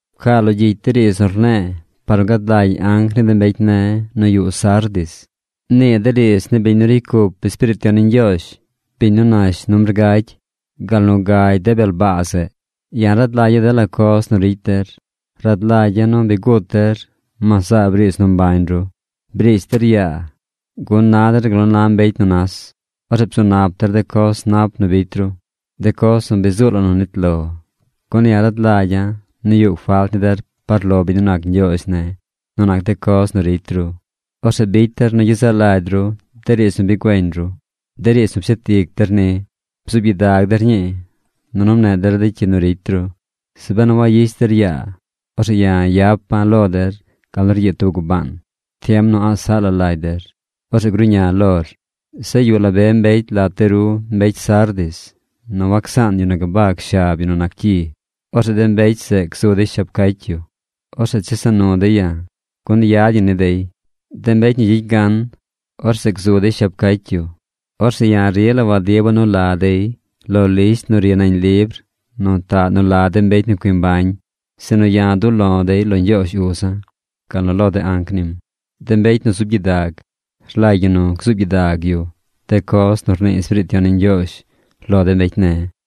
’Pcaa lo gyicy de riidz nu rne̱e̱ par nu gad lagy anc ni de mbecy ne̱ nu yuꞌ Sardis: “Nii de riidz ni biñ nu ricy cup Espiriit Yon ni Ñgyoozh, biñ nu nash numbr gagy, gal nu gagy de bel baa zeꞌ. Ya̱ rad lagya̱ dela coz nu ricy der. Rad lagya̱ nu bi gut der, mas zaab riidz nu mbañ ru. Brish der yaa, gun na der gal nu na mbecy nu nas. Orzeꞌ bzu nap der de coz nap nu bicy ru, de coz nu bi zuu la nu nit lo, gun ya̱ rad lagya̱ nu yuꞌ falt ni der par lo biñ nu nac Ñgyoozh ne̱ nu nac de coz nu ricy ru. Orzeꞌ bicy der nu gyezaꞌ lagy ru de riidz nu bi güeñ ru, de riidz nu bi pshet ic der ni. Bzuub gyidag der ñii, nunu mneꞌ der de cyi nu ricy ru. Zeꞌ benu wayish der yaa, orzeꞌ ya̱ yapa̱ lo der gal nu ryiid tub gubaan. Tiem nu a̱ꞌ saꞌ la lagy der, orzeꞌ gruꞌña̱ lor. Zeꞌ yuꞌ la be mbecy lat de ru mbecy Sardis nu wacsaan yu nu gabag shab yu nu nac cyi. Orzeꞌ de mbecy zeꞌ gzu dey shab cacy yu. Orzeꞌ chesa nu dey ya̱, gun yad ñi ni dey. De mbecy nu gyicy gan, orzeꞌ gzu dey shab cacy yu. Orzeꞌ ya̱ rila wadiba̱ nu la dey lo lisht nu ri nañ libr nu taꞌ nu la de mbecy nu cui mbañ, sinu ya̱ du̱ꞌ lo̱ dey lo Ñgyoozh Uza̱ gal nu lo de anc nim. ¡De mbecy nu zub gyidag, rlagy ñi nu gzuub gyidag yu de coz nu rnii Espiriit Yon ni Ñgyoozh lo de mbecy ne̱!”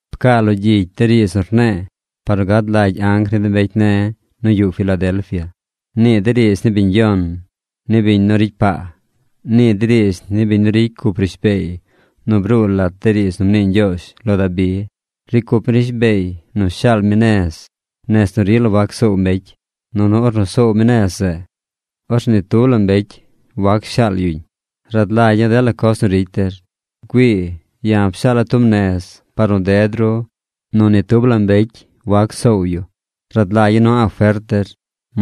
’Pcaa lo gyicy de riidz nu rne̱e̱ par nu gad lagy anc ni de mbecy ne̱ nu yuꞌ Filadelfia: “Nii de riidz ni biñ yon, ni biñ nu ricy paa. Nii de riidz ni biñ nu ricy cup rishbeey nu bruu lat de riidz nu mnii Ñgyoozh lo Dabi. Ricy cup mi rishbeey nu shaal mi nez, nez nu rila wac soow mbecy. Nunu ornu soow mi nez zeꞌ, orzeꞌ ni tub la mbecy wac shaal yu. Rad lagya̱ dela coz nu ricy der. ¡Güii! Ya̱ pshaala̱ tub nez par de ru nu ni tub la mbecy wac soow yu. Rad lagya̱ nu a̱ꞌ fert der.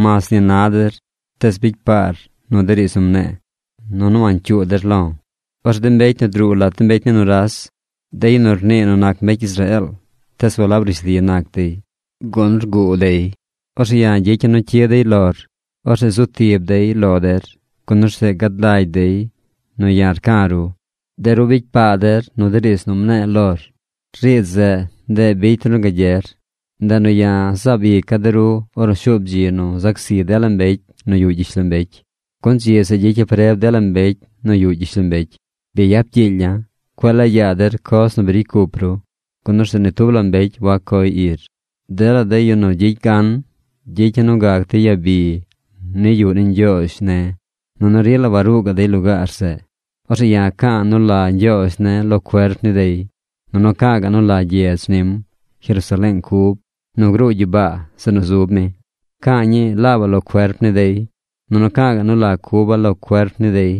Mas ni na der, tees bicy paar nu de riidz nu mne̱e̱, nunu wancyuu der lo̱. Orzeꞌ de mbecy nu druu lat de mbecy ni nuras, de yu nu rnii nu nac mbecy Israeel, tees walab rishli nac dey, gun rguu dey, orzeꞌ gyicya̱ nu cyid dey lor. Orzeꞌ zu tib dey lo der, gun orzeꞌ gad lagy dey nu ya̱ rca̱ ru. De ru bicy paa der nu de riidz nu mne̱e̱ lor. Riidz zeꞌ, ndeꞌ bicy der nu gagyer. Ndeꞌ nu ya̱ zaab ica̱ de ru ornu shuub dzi nu zac zi dela mbecy nu yuꞌ gyishlombecy, gun dzi zeꞌ gyicya̱ preb dela mbecy nu yuꞌ gyishlombecy. Bi yap gyiilya̱. Cueꞌ laa yaa der coz nu bi ricy cup ru, gun orzeꞌ ni tub la mbecy wac coy ir. Dela de yu nu gyicy gan, gyicya̱ nu gac dey yabi ni yuꞌ ni Ñgyoozh ne̱. Nunu rila waruu gaꞌ dey lugaar zeꞌ. Orzeꞌ ya̱ ca̱a̱ nu la Ñgyoozh ne̱ lo cuerp ni dey. Nunu ca̱a̱ ga̱ꞌ nu la gyedz nim, Jerusaleeng cub nu gruu gyibaa zeꞌ nu zub mi. Ca̱a̱ ñii laabaꞌ lo cuerp ni dey. Nunu ca̱a̱ ga̱ꞌ nu la cuba̱ laab lo cuerp ni dey.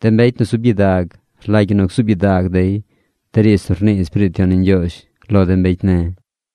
¡De mbecy nu zub gyidag, rlagy ñi nu gzuub gyidag dey de riidz nu rnii Espiriit Yon ni Ñgyoozh lo de mbecy ne̱!”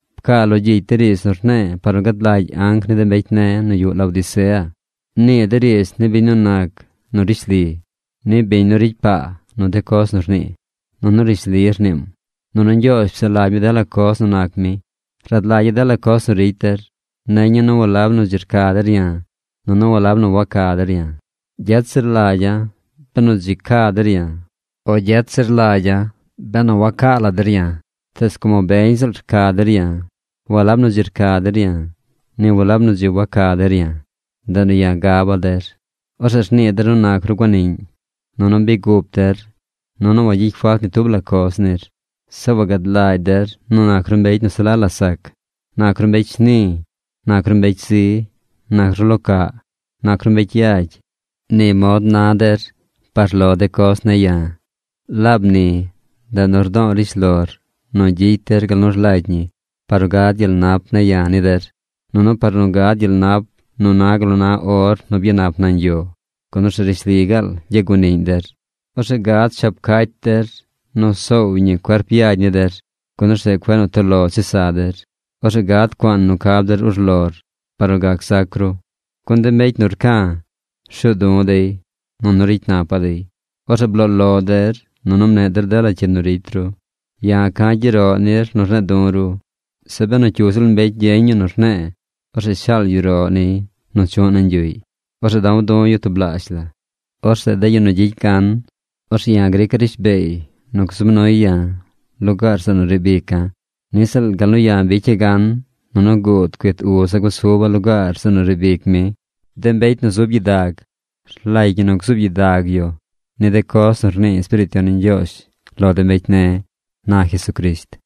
’Pcaa lo gyicy de riidz nu rne̱e̱ par nu gad lagy anc ni de mbecy ne̱ nu yuꞌ Laodicea. “Nii de riidz ni biñ nu nac nu rishli, ni biñ nu ricy paa nu de coz nu rnii. Nunu rishli rniim. Nunu Ñgyoozh psaꞌ lagy mi dela coz nu nac mi. Rad lagya̱ dela coz nu ricy der. Neña̱ nu walab nu dzi rca der ya̱, nunu walab nu waca der ya̱. Gyet zir lagya̱ benu dzi ca der ya̱, o gyet zir lagya̱ benu wacaa la der ya̱. Tees como beñ ziꞌl rca der ya̱, walab nu dzi rca der ya̱, ni walab nu dzi waca der ya̱, ndeꞌ nu ya̱ gaba̱ der. Orzeꞌ rnii der nu nac ru guaniꞌñ, nunu bi gup der, nu wagyicy falt ni tub la coz nir. Zeꞌ wagad lagy der nu nac ru mbecy nu se la la sac. Nac ru mbecy shni. Nac ru mbecy zi. Nac ru lo caꞌ. Nac ru mbecy yagy. Ni mod na der par de coz ne̱ ya̱. Laab ni ndeꞌ nu rdo̱o̱ rishlor nu gyicy der gal nu rlagy ñi par nu gad gyel nap ne̱ ya̱ ni der, nunu par nu gad gyel nap nu na gal nu na or nu byanap nañ yo, gun orzeꞌ rishli gaal gyaguaniꞌñ der. Orzeꞌ gad shab cacy der nu soow ñi cuerp yagy ni der, gun orzeꞌ cueꞌ nu toꞌ lo chesa der. Orzeꞌ gad cuaan nu cab der urlor par nu gac zac ru. Gun de mbecy nu rca̱, rshuu du̱ dey, nunu ricy napa̱ dey. Orzeꞌ bloo lo der, nunu mneꞌ der dela cyi nu ricy ru. Ya̱ ca̱ gyeroꞌ nir nu rne̱e̱ du̱ ru. Zeꞌ benu cyu ziꞌl mbecy gyeñ yu nu rne̱e̱, orzeꞌ shaal yu roꞌ niy nu chu̱ꞌ nañ yuꞌy. Orzeꞌ da̱w du̱ yu tublaazh la. Orzeꞌ de yu nu gyicy gan, orzeꞌ ya̱ grica̱ rishbeey nu gzub nuy ya̱ lugaar zeꞌ nu riib ica̱, niꞌ ziꞌl gal nu ya̱ bicya̱ gan, nunu guud cuit Uza̱ gusuba̱ lugaar zeꞌ nu riib ic mi. ¡De mbecy nu zub gyidag, rlagy ñi nu gzuub gyidag yu ni de coz nu rnii Espiriit Yon ni Ñgyoozh lo de mbecy ne̱!” ―na Jesucrisht.